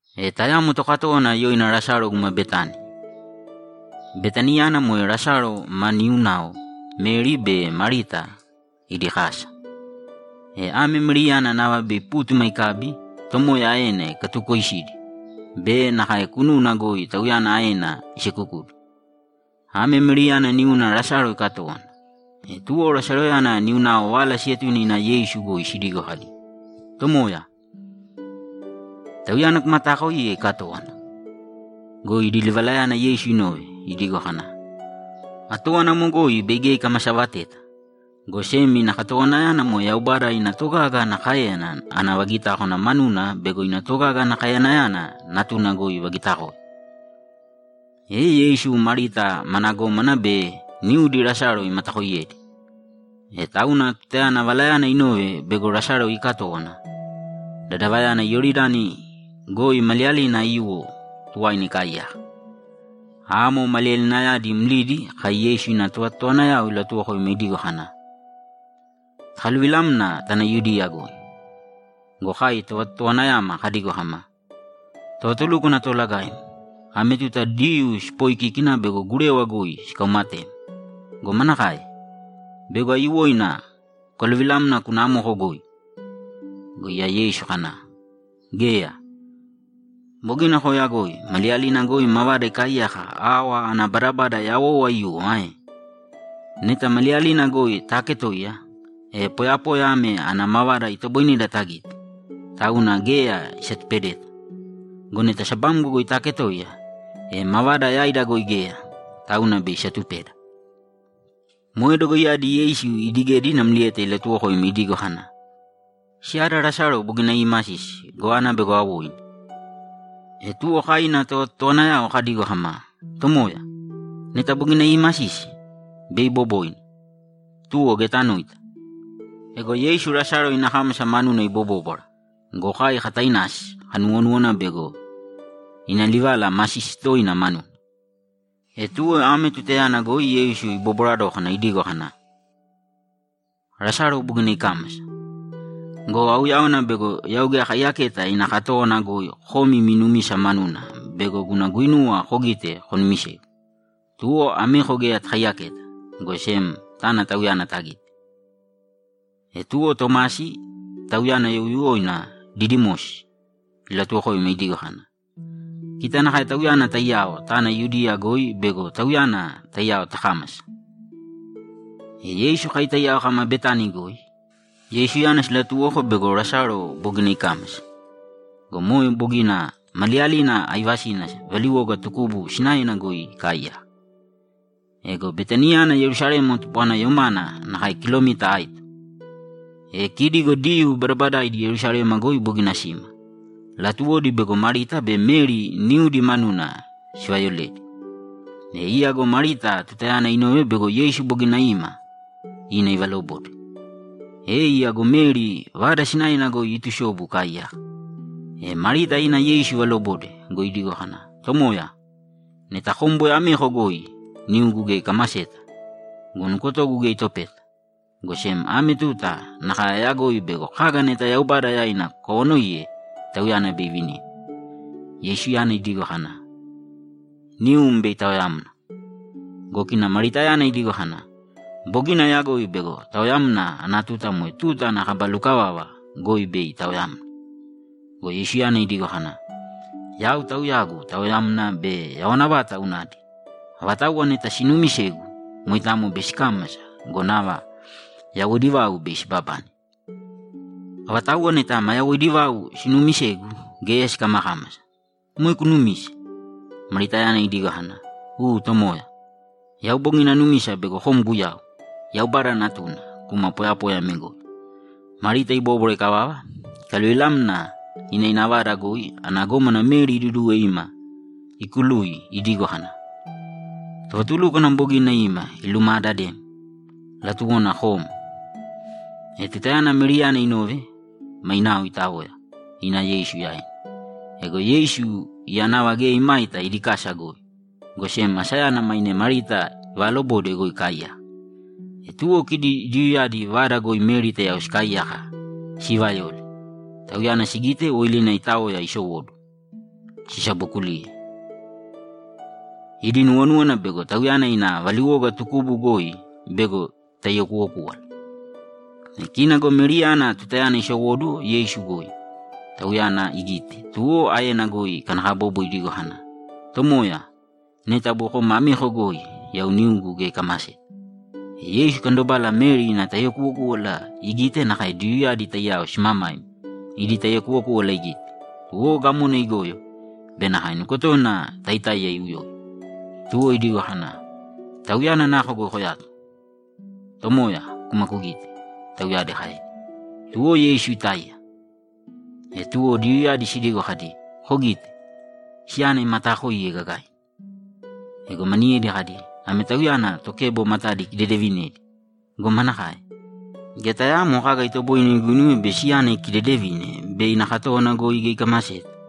E tayamo tokatówana yoina Lasalo guma Betani. Betaniyana moe Lasalo ma niunao Meri be Marita idi kasa. E ame Meriyana nava bei pútuma ikabi, Tomoya aena ikatukoisidi be nakae kununa goi Tauyana aena isekukudi. Ame Meriyana niuna Lasalo ikatówana. E tuwo Lasaloyana niunao vala sietune ina Yeisu goi sidigo kadi, ‘Tomoya, tauyana kumataakoiye ikatówana.’ Go idi livalayana Yeisu inove, idigo kana, ‘Atówana amo goi bei geya ikamasavateta, go sem ina katowanayana moe Yaubada ina togaga ana káeyana ana vagitákwana manuna bego ina togaga ana kaeyanayana Natuna goi ivagitakoe.’ E Yeisu Marita mana gómana be niudi Lasalo imatakooiyedi. E tauna tutayana valayana inove bego Lasalo iikatówana, dadavayana Iyoridani goi maliyalina aiyuwo tuwaina ikaaiyaka. Amo maliyalinayadi mlidi kai Yeisu ina tovatotowanayao ilatuwokoima idigo kana, ‘Takaluvilāmna tāna Yudiya goi.’ Go kai tovatotowanayama kadigo kama, ‘Tovatulúkwana Toolagaim, ame tuta Diyuu sipooikíkina bego gurewa goi sikaumatem go, manakae? Bego aiyuwoina kukaluvilamna kuna amoko goi?’ Go iya Yeisu kana, ‘Geya. Bogina kooyagoi maliyalina goi mavada ikaaiyaka awa ana badabada yawou aiyuwo ae? Neta maliyalina goi taaketoiya, e poyapoya ame ana mavada itoboineda tagite, tauna geya isatupedeta. Go neta sabamgo goi taaketoiya, e mavada yaida goi geya, tauna bei isatupeda.’ Moe dogoiyadi Yeisu idigedi namlieta ilatuwokoima idigo kana, ‘Siyada Lasalo bogina iimasisi go, ana bego awoini.’ E tuwo kai ina tovatotowanayao kadigo kama, ‘Tomoya, neta bogina iimasisi, bei iboboina, tuwo geya tanoita.’ Ego Yeisu Lasalo ina kámasa manuna ibobóbwara go, kai katainasi, kanuwonúwana bego ina livala masisi toina manuna. E tuwo ame tutayana goi Yeisu ibobwara dókana idigo kana, ‘Lasalo bogina ikámasa go, auyáwana bego yau geya akaiyaketa ina katówana goi komi imi numisa manuna bego guna guinuwa kogite konumisegu. Tuwo ameko geya takaiyaketa, go sem tāna tauyana tagīte.’ E tuwo Tomasi, tauyana youyuwoina Didimosi, ilatuwokoima idigo kana, ‘Kita nakae Tauyana taiyao tāna Yudiya goi bego Tauyana taiyao takámasa.’ E Yeisu kai taiyao kama Betani goi, Yeisuyana silatuwoko bego Lasalo bogina ikámasa go, moe bogina maliyalina aivasina valiwoga tukubu sinaena goi ikaaiyaka. Ego Betaniyana Yerusalema tupwana yomana nakae kilomita aito. E kidi go Diyuu badabadaaidi Yerusalema goi bogina sima; latuwodi bego Marita be Meri niudi manuna sivayoledi. E iya go Marita tutayana inove bego Yeisu bogina ima, ina ivalobode. E iya go Meri vada sinaena goi iitusobu ikaaiyaka. E Marita ina Yeisu ivalobode go, idigo kana, ‘Tomoya, neta kom boi ameko goi, niugu geya ikamaseta go, nukotogu geya itopeta, go sem ame tuta nakae ayagoi bego kaga neta Yaubada yaina kukawanoiye, Tauyana bei ivinim.’ Yeisuyana idigo kana, ‘Nium bei itaoyamna.’ Go kina Maritayana idigo kana, ‘Bogina ayagoi bego taoyamna ana tuta moe tuta ana kaba lukavava goi bei itaoyamna.’ Go Yeisuyana idigo kana, ‘Yau Tauyagu taoyamna be yawana vata unadi. Avatauwa neta sinuumisegu, moitamo bei sikámasa go, nava yawoidi vau bei sibabane. Avatauwa neta maa yawoidi vau sinuumisegu, geya sikamakámasa. Moe kunumise?’ Maritayana idigo kana, ‘U Tomoya. Yau bogina anumisa bego kom Guyau, Yaubada Natuna kuma poyapoya ame goi.’ Marita ibóbwara ikavava, ikaluvilamna ina ina vada goi ana gómana Meri iduduwe ima ikului idigo kana, ‘Tovatulúkwana bogina ima ilumaadadem; latuwona kom.’ E tutayana Meriyana inove, mainao itaoya, ina Yeisu yaina. Ego Yeisu iya nava geya imaita idi kasa goi, go sem asayana maine Marita ivaalobode goi ikaaiyaka. E tuwo kidi Diyuuyadi vada goi Meri taiyao sikaaiyaka siivayole, tauyana sigite woilina itaoya isowóduwo, sisabokuliye. Idi nuwonúwana bego tauyana ina valiwoga tukubu goi bego itaiyakuwokúwala. E kina go Meriyana tutayana isowóduwo Yeisu goi, Tauyana igite, tuwo aena goi ikanakabobo idigo kana, ‘Tomoya, neta boi kom ameko goi, yau niugu geya ikamaseta.’ E Yeisu ikandobala Meri ina taiyakuwokúwala igite nakae Diyuuyadi taiyao simamaima idi taiyakuwokúwala igite, tuwo gamona igoyo be nakae nukotona taitáiya iuyoi. Tuwo idigo kana, ‘Tauyana nako goi koyato?’ ‘Tomoya, kūma kugīte’, tauyadi kaedi. Tuwo Yeisu itáiya. E tuwo Diyuuyadi sidigo kadi, ‘Kogīte. Siyana imataakoiye gagaina!’ Ego maniyedi kadi, ‘Ame Tauyana tokebo matadi ikidedevinedi go, manakae? Geya tayaamo kaga itoboine iguinuwe bego siyana ikidedevine bei ina katówana goi geya ikamaseta?’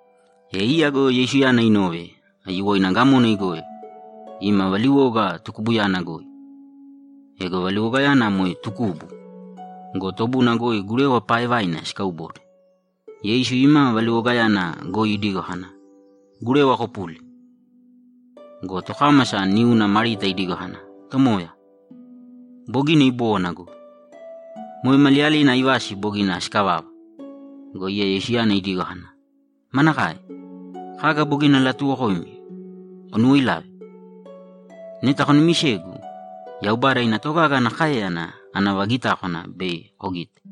E iya go Yeisuyana inove, aiyuwoina gamona igoyo, ima valiwoga tukubuyana goi. Ego valiwogayana moe tukubu go, tobuna goi gurewa paaevaina sikaubode. Yeisu ima valiwogayana goi idigo kana, ‘Gurewa kopūli!’ Go tokámasa niuna Marita idigo kana, ‘Tomoya, bogina ibówana go! Moe maliyalina aivasi bogina sikavava!’ Go iya Yeisuyana idigo kana, ‘Manakae? Kaga bogina alatuuwokoim kunuwoilave? Neta kunumisegu, Yaubada ina togaga ana káeyana ana vagitákwana bei kugite!’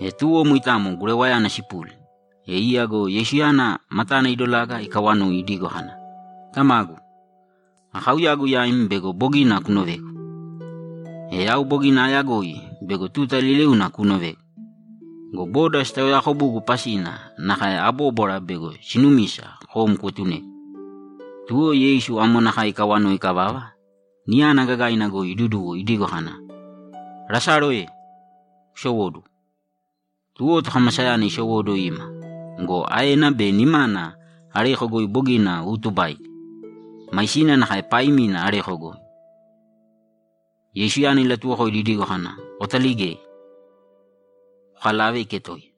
E tuwo moitamo gurewayana sipuli. E iya go Yeisuyana matana idolaga ikawanoi idigo kana, ‘Tamagu, akauyagu yaim bego bogina kunovegu. E yau bogina aayagoi bego tuta liliuna kuunovegu go, boda sitaoyaakobugu pasina nakae abóbwara bego sinumisa kom kuetunegu.’ Tuwo Yeisu amo nakae ikawanoi ikavava, niyana gagaina goi iduduwo idigo kana, ‘Lasalo e! Kusowōduwo!’ Tuwo tokamasayana isowóduwo ima go, aena be nimana areko goi bogina uutubaidi. Maisina nakae paaimina areko goi. Yeisuyana ilatuwokoidi idigo kana, ‘Kotaligēi, kokalāve iketoiya!’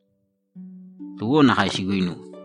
Tuwo nakae siguinuwe.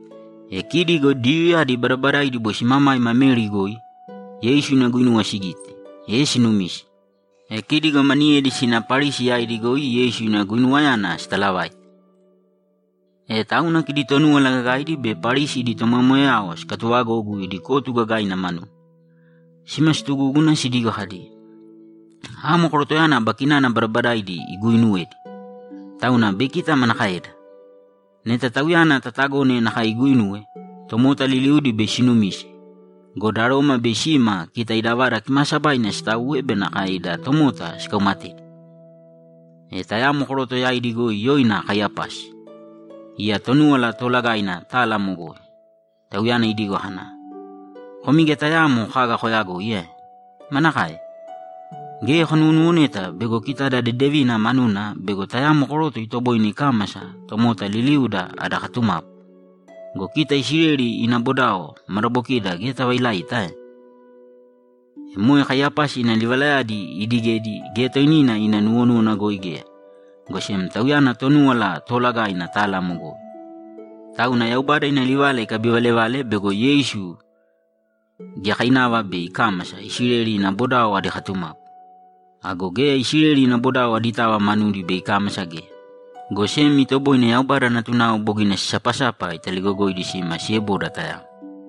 E kidi go Diyuuyadi badabadaidi boi simamaima Meri goi, Yeisu ina guinuwa sigite, e sinumise. E kidi go maniyedi sina Parisi yaidi goi Yeisu ina guinuwayana sitalavaite. E tauna kidi Tonúwala Gagaidi be Parisi idi tomoyamoyayao sikatuvagogu idi kotu gagaina manuna. Sima situgúguna sidigo kadi, ‘Amo korotoyana aba kinana badabadaidi iguuinuwedi. Tauna bei kita manakaeda? Neta Tauyana tatagone nakae iguuinuwe, tomota liliudi bei sinumise go, da Roma bei sima kita ida Vada Kimaasabaina sitauwe be nakae ida tomota sikaumatedi!’ E tayamo koroto yaidi goi yoina Kaiyapasi. Iya Tonúwala Toolagaina tala amo goi. Tauyana idigo kana, ‘Komi geya tayaamo kaga koyagoi ae? Manakae? Geya konuwonuwoneta bego kita ada dedevina manuna bego tayamo koroto itoboine ikámasa tomota liliuda ada katumapu go, kita Isileli ina bodao madabokida geya tavailaita ae?’ E moe Kaiyapasi ina livalayadi iidigedi geya toinina ina nuwonúwana goi geya, go sem tauyana Tonúwala Toolagaina tala amo goi, tauna Yaubada ina livala ikabivalevale bego Yeisu giyakainava bei ikámasa Isileli ina bodao adi katumapu. Ago geya Isileli ina bodao aditava manudi bei ikámasa geya, go sem itoboine Yaubada natunao bogina sisapasapa italigogoidi sima sieboda tayamo.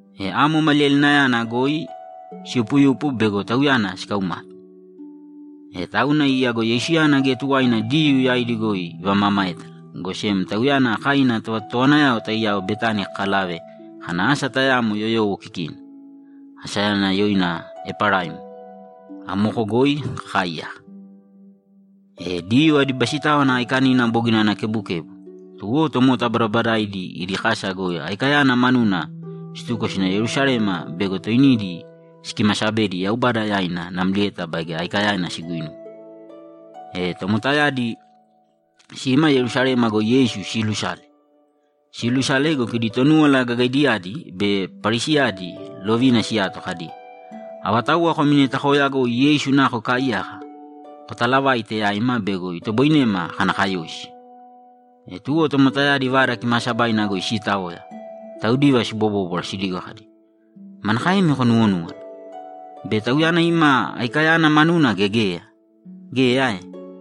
E amo maliyalinayana goi siyupuyupu bego Tauyana sikaumate. E tauna iya go Yeisuyana geya tuwaina Diyuu yaidi goi ivamamaétala, go sem Tauyana kai ina tovatotowanayao taiyao Betani kakalave kana asa tayamo yoyowo kikina. Asayana yoina Eparaim. Amoko goi kakaaiyaka. E Diyuu adi Basitáwana Aikanina bogina ana kebukebu. Tuwo tomota badabadaidi idi kasa goi Aikayana manuna situko sina Yerusalema bego toinidi sikimasabedi Yaubada yaina namlieta baige Aikayana siguinuwe. E tomotayadi sima Yerusalema goi Yeisu siilusale. Siilusale go, kidi Tonúwala Gagaidiyadi be Parisiyadi lovina siyato kadi, ‘Avatauwa komi neta kooyagoi Yeisu nako ikaaiyaka, kotalavāite yaima bego itoboinema kana kayoisi.’ E tuwo tomotayadi Vada Kimaasabaina goi siitaoya, taudiva sibobóbwara sidigo kadi, ‘Manakaemi konuwonúwana? Bei Tauyana ima Aikayana manuna gea geya? Geya ae?’